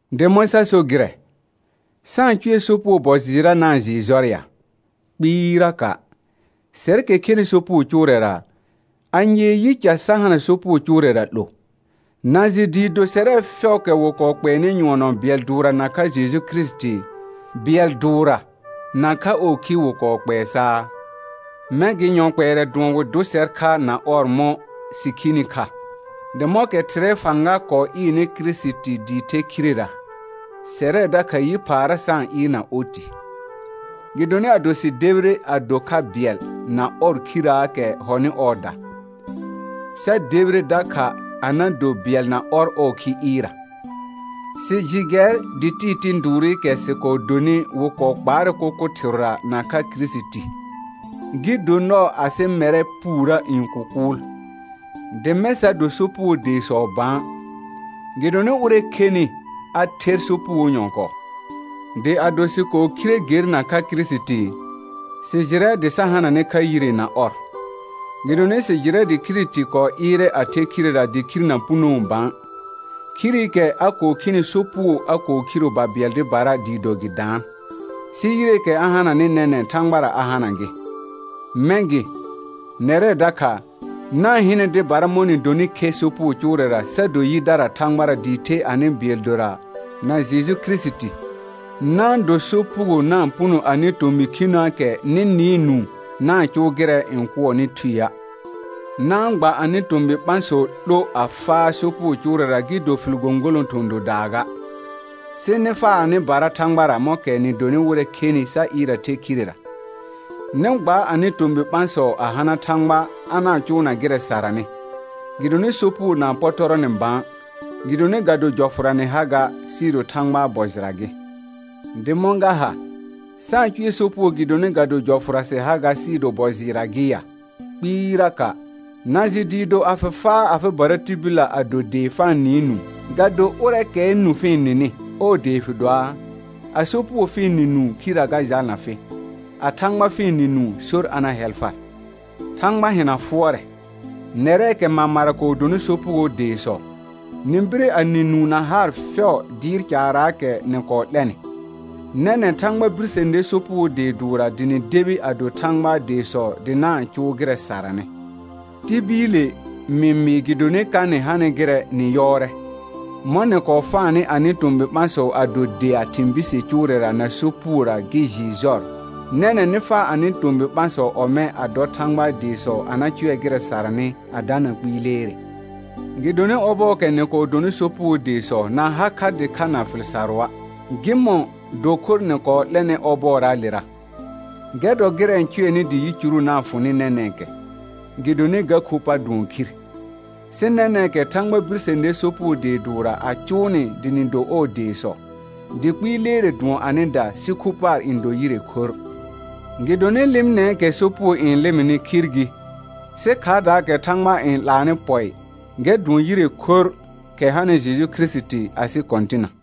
Dɩ mɔ̃ sa so gɩrɛ? Sa-n cʋɛ sopugo bɔ jɩɩrra na-n jɩɩ jɔr ya? Kpɩɩraka'. Sɛrkɛ khenɩ sopugo cʋʋrɛra, anyee yi ca sa hana sopugo cʋʋrɛra 'lo? Na jɩ dɩɩ do sɛrɛ fɛʋʋkɛ wɩ kɔɔ kpɛɛnɩ nyʋɔnɔ bɩɛl dʋʋrra nakha Jeju Kirisiti, bɩɛl dʋʋrra nakha ɔɔ khi wɩ kɔɔ kpɛɛ saa? Mɛ̃ gɩ yɔ kpɛɛrɛ dʋɔn wɩ dʋ sɛr kha na ɔr mɔ̃ sɩ khini kha, dɩ mɔ̃kɛ Thɩrɛɛ fãga kɔɔ ɩɩrnɩ Kirisiti dɩ the khirera, sɛrɛ dakha yi phaara sa-n ɩɩrna oti. Gɩdonɩ ado sɩ debire a do kha bɩɛl na ɔr khirraakɛ hɔnɩ ɔɔda, sa debire dakha a na do bɩɛl na ɔr ɔɔ khi ɩɩrra. Sɩ jɩ gɛr dɩ tɩɩ tɩ̃ dʋʋrɩkɛ sɩ kɔɔ donɩ wɩ kɔɔ kpaarɛ kʋkʋ thɩrʋra nakha Kirisiti, gɩ do nɔɔ asɩ mɛrɛ puurə n kʋkʋʋl, dɩ mɛ̃ sa do sopugoo deesɔ bã. Gɩdonɩ ʋrɛ khenɩ a ther sopugoo nyɔ̃kɔɔ. Dɩ ado sɩ kɔɔ khire ger nakha Kirisiti, sɩ jɩrɛ dɩ sa hananɛ kha yire na ɔr. Gɩdonɩ sɩ jɩrɛ dɩ Kirisiti kɔɔ ɩɩrɛ a the khirera dɩ khir na punoo bã. Khirikɛ a kɔɔ khini sopugo a kɔɔ khiro babɩɛl dɩbara dɩɩ do gɩ daan, sɩ yireekɛ a hananɩ nɛnɛ̃ Thãgbara a hana gɩ. Mɛ̃ gɩ, nɛrɛ dakha, na-n hɩnɛ dɩbara mɔ̃ nɩ donɩ khe sopugo cʋʋrɛra sa do yidara Thãgbara dɩɩ the anɩ bɩɛl dora na Jeju Kirisiti. Na-n do sopugo na-n puno anɩ tomɩ khinəəkɛ nɩ nɩɩ nũu na-n cʋʋ gɩrɛ n kʋɔnɩ thueə'. Na-n gba anɩ tomɩ ɓãsɔ 'lo a faa sopugo cʋʋrɛra gɩ do fɩl gõgolõ thɔ̃ dodaa ga; sɩ nɩ faa anɩbara Thãgbara mɔ̃kɛ nɩ donɩ wɩrɛ khenɩ sa ɩɩr a the khirera, nɩ gba anɩ tomɩ ɓãsɔ a na hana Thãgba a na-n cʋʋna gɩrɛ saranɩ. Gɩdonɩ sopugo na-n pɔtɔrɔ nɩ bã, gɩdonɩ ga do jɔfʋra nɩ ha ga, sɩɩ do Thãgbaa bɔ jɩra gɩ. Dɩ mɔ̃ ga ha? Sa-n cʋɛ sopugo gɩdonɩ ga do jɔfʋra sɩ ha ga sɩɩ do bɔ jɩɩrra gɩ ya? Kpɩɩraka'. Na jɩ dɩɩ do a fɩ faa afɩbara tibillə a do dee fa-n nɩɩ nũu, ga do ʋrɛɛkɛɛ nũ fɩ-n nɩnɩ ɔɔ dee fɩ doaa, a sopugo fɩ-n nɩ nũu khirrə ga jalna fɩ, a Thãgba fɩ-n nɩ nũu sor a na hɛl far. Thãgba hɩna fʋɔrɛ. Nɛrɛɛkɛ mamara kɔɔ dɔnɩ sopugoo deesɔ, nɩ bire a nɩ nũu na haar fɛʋ dɩɩr caaraakɛ nɩ kɔɔ 'lɛnɩ. Nɛnɛ̃ Thãgba birse ner sopugo dee dʋʋrra dɩ nɩ debi a do Thãgbaa deesɔ dɩ na-n cʋʋ gɩrɛ saranɩ. Tibiile mɩ mɩɩ gɩdonɩ ka nɩ hanɩ gɩrɛ nɩ yɔɔrɛ; mɔ̃ nɩ kɔɔ faanɩ anɩ tomɩ ɓãsɔ a do dea thɩ̃ bise cʋʋrɛra na sopugora gɩ jɩɩ jɔr, nɛnɛ̃ nɩ faa anɩ tomɩ ɓãsɔ ɔmɛ̃ a dɔ Thãgbaa deesɔ a na cʋɛ gɩrɛ saranɩ a dana kpɩɩ leere. Gɩdonɩ ɔbɔɔkɛ nɩ kɔɔ donɩ sopugoo deesɔ na ha kha dɩkha na fɩl sarʋa'. Gɩmɔ̃ dɔ khor nɩ kɔɔ 'lɛrnɩ ɔbɔɔraalera? Gɛr dɔ gɩrɛ cʋɛnɩ dɩ yicuru na-n fʋ nɩ nɛnɛ̃kɛ, gɩdonɩ ga khu pa dʋɔn khir. Sɩ nɛnɛ̃kɛ Thãgba birse ner sopugo dee dʋʋrra a cʋʋ nɩ dɩ nɩ do ɔɔ deesɔ, dɩ kpɩɩ leere dʋɔn anɩda sɩ khu paar n do yire khorr. Gɩdonɩ lɩmɩnɛɛkɛ sopugo n lɩmɩnɩ khir gɩ, sɩ khaardaakɛ Thãgba n 'laanɩ pɔɩ, gɛr dʋɔn yire khorr, kɛ hanɩ Jeju Kirisiti asɩ Kɔ̃tɩna.